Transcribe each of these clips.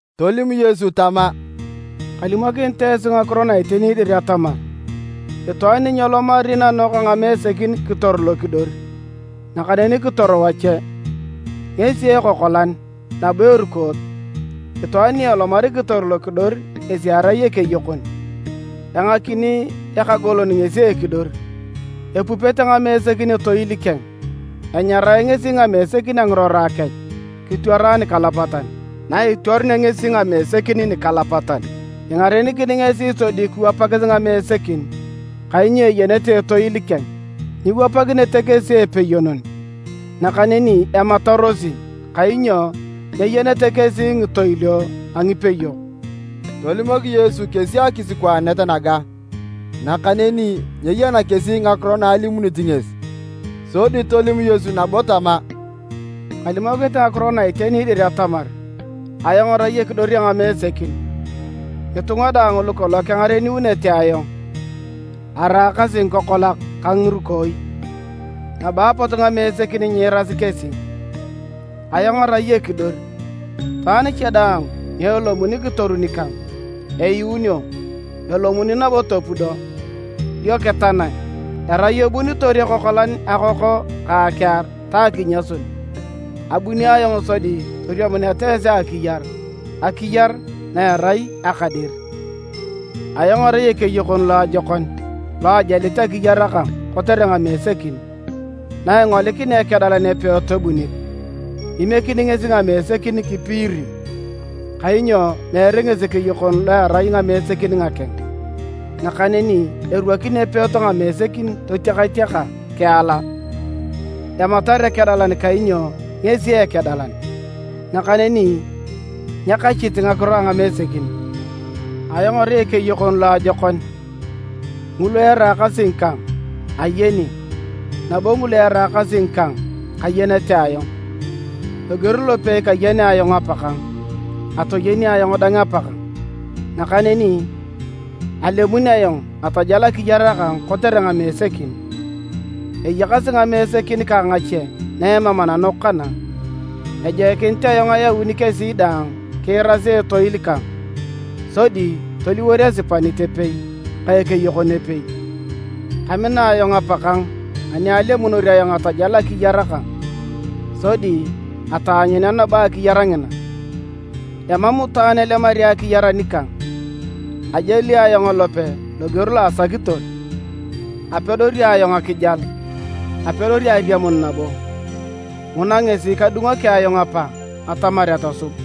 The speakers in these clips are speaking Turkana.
Tolim Yesu tama, “Kalimokinit esi ngakiro na iteni dir atamar itwaan ni nyelomari nanok a ngamesekin kitor lokidor, nakaneni kitor wache, ngesi ekokolan nabo erukoot. Itwaan ni elomari kitor lokidor ngesi erai ekeyokon. Engakini ekagolon ngesi ekidor, epupete ngamesekin etoil keng, enyarae ngesi ngamesekin a ngirora kech, kitwara nikalapatan. Na itwarunea ngesi ngamesekin nikalapatan, ingarenikini ngesi sodi kiwapakis ngamesekin kainyo eyenete etoil keng. Nyiwapakinete kesi epeyonon, nakaneni ematarosi, kainyo nyeyenete kesi ngitoilio a ngipeyok.” Tolimok Yesu kesi akisikwaanet naga, nakaneni nyeyena kesi ngakiro na alimunit ngesi. Sodi tolim Yesu nabo tama, “Kalimokinit ngakiro na iteni dir atamar ayong arai ekidor a ngamesekin. Ngitunga daang lukolong kengareniunete ayong, araakasi ngikokolak ka ngirukooi, nabo apot ngamesekin nyiirasi kesi. Ayong arai ekidor, itwaan cha daang ni elomuni kitoru nikang, eyuunio, elomuni nabo topudo, dio kitanae. Erai ebunitor ekokolan akoko ka akiar ta akinyasun. Abuni ayong sodi toriamuneta esi akiyar, akiyar na erai aka dir. “Ayong arai ekeyokon loajokon lo ajalit akiyar kang kotere ngamesekin. Na ingolikinea ekedalan epeot ebunit, imiekini ngesi ngamesekin kipiiri, kainyo meere ngesi ekeyokon lo erai ngamesekin ngakeng. Nakaneni erwakin epeot ngamesekin totiakatiaka kiala. Ematar ekedalan kainyo ngesi ekedalan, nakaneni nyekachit ngakiro a ngamesekin. Ayong arai ekeyokon loajokon, ngulu eraakasi ngikang, ayeni, nabo ngulu eraakasi ngikang, kayenete ayong. Loger lopei kayenea ayong Apakang, atoyeni ayong dang Apakang. Nakaneni alemun ayong atajal akiyar kang kotere ngamesekin. Eyakasi ngamesekin kang ngache na emam ananok kana. Ejoikinit ayong ayauni kesi dang kiirasi etoil kang, sodi toliwor esipanit epei ka ekeyokon epei. “Kamina ayong Apakang anialemunor ayong atajal akiyar kang, sodi ataanyunea nabo akiyar ngina. Emam itwaan elemari akiyar anikang. Ajali ayong elope loger lo asakitor. Apedori ayong akijal, apedori ariamun nabo. Nguna ngesi kadungoki ayong Apa atamar atosub.”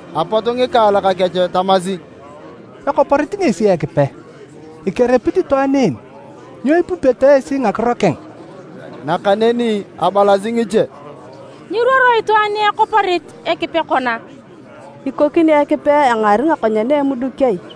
Apot ngikaalak kech tamasi, “Ekoporit ngesi Ekipe! Ikeripikinit itwaan en. Nyo ipupeto esi ngakiro keng?” Nakaneni abalasi ngiche, “Nyiruoro itwaan ni ekoporit Ekipe kona! Ikokini Ekipe engaari ngakonyen a emuduk ai?”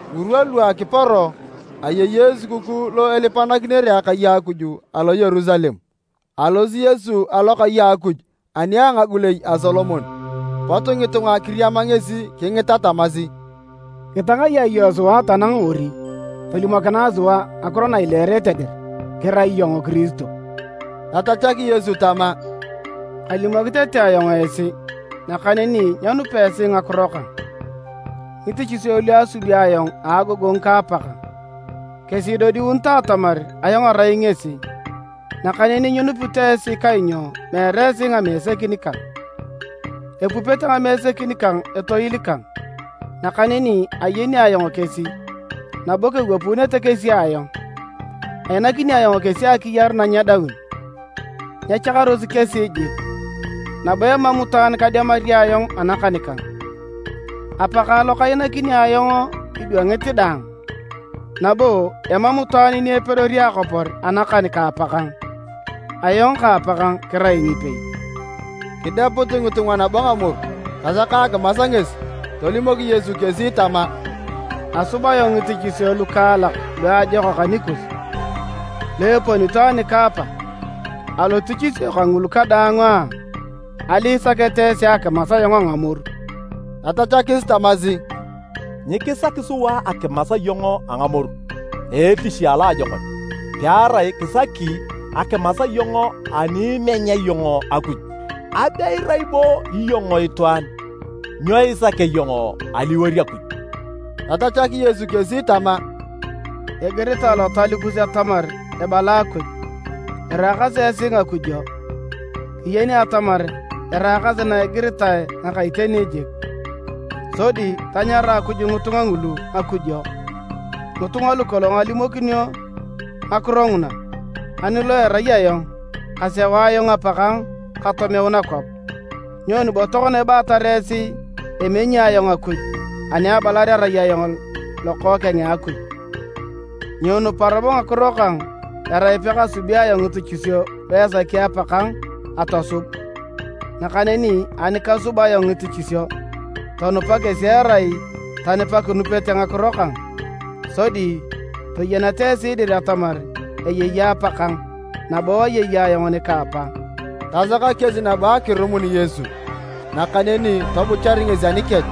Ngirwa lu akiporo, ayei Esukukuu lo ilipakinitere Akai a Akuj alo Yerusalem. Alosi Yesu alokai a Akuj ani a ngagulei a Solomon, pot ngitunga kiriama ngesi kingita tamasi, “Kitangayae iyong sua tanang ori: tolimokinae sua ngakiro na ileerete dir kirai iyong Kiristo?” Tatachak Yesu tama, “Kalimok tete ayong esi, nakaneni nyenupa esi ngakiro kang. Ngitichisio lu asubi ayong a agogongu ka Apakang, kesi idodiunito atamar ayong arai ngesi, nakaneni nyinupito esi kainyo meere esi ngamesekin kang. Epupete ngamesekin kang etoil kang, nakaneni ayeni ayong kesi, nabo kewapuunete kesi ayong. Ainakini ayong kesi akiyar na nyedaun, nyechakarosi kesi jik, nabo emam itwaan kademari ayong anakan kang. Apakang lo kainakini ayong idwangit daang, nabo emam itwaan ni epedori akopor anakan ka Apakang. Ayong ka Apakang kirai ngipei.” Kideput ngitunga nabo ngamoru tasaka akimas ngesi. Tolimok Yesu kesi tama, “Asub ayong ngitichisio lukaalak luajokak anikus, lu eponito ani ka Apa. Alotichisio kangulu kadaang a, ali isaketa esi akimas ayong a ngamoru?” Tatachakis tamasi, “Nyikisaki sua akimas iyong a ngamoru a etich a loajokon, pearai kisaki akimas iyong ani imenya iyong Akuj! Abe irai bo iyong itwaan, nyo isakea iyong aliwor Akuj!” Tatachak Yesu kesi tama, “Igiritae Lotal kus atamar ebala Akuj, ‘Iraakasi esi ngakujo.’ Kiyeni atamar eraakasi na igiritae ngaka iteni jik, sodi tanyara Akuj ngitunga ngulu ngakujo, ngitunga lukolong alimokinio ngakiro nguna. Ani lo erai ayong, kaseu ayong Apakang katomeu nakwap. Nyoni bo tokona ibaatar esi emenyi ayong Akuj ani abalar arai ayong Lokookeng a Akuj? Nyiinupa robo ngakiro kang erai pekasubi ayong ngitichisio luesaki Apakang atosub. Nakaneni ani kasub ayong ngitichisio, tonupa kesi erai tani pakinupete ngakiro kang. Sodi toyeneta esi dir atamar eyei Apa nikang, nabo ayei ayong nika Apa.” Tasaka kesi nabo akirumun Yesu, nakaneni tobuchar ngesi anikech.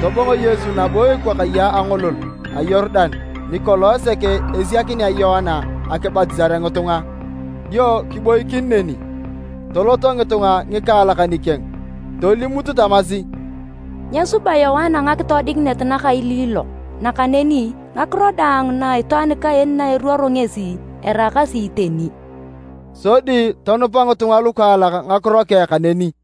Tobongo Yesu nabo ekwakaye a angolol a Yorudan nikolong sek esiakinea Yoana akibatisare ngitunga, dio kiboikin neni. Toloto ngitunga ngikaalak nikeng, tolimut tamasi, “Nyesuba Yoana ngakitoodikinet nakailiilok, nakaneni ngakiro daang na itwaan kaen na eruoro ngesi, eraakasi iteni.” Sodi tonupa ngitunga lukaalak ngakiro keng kaneni.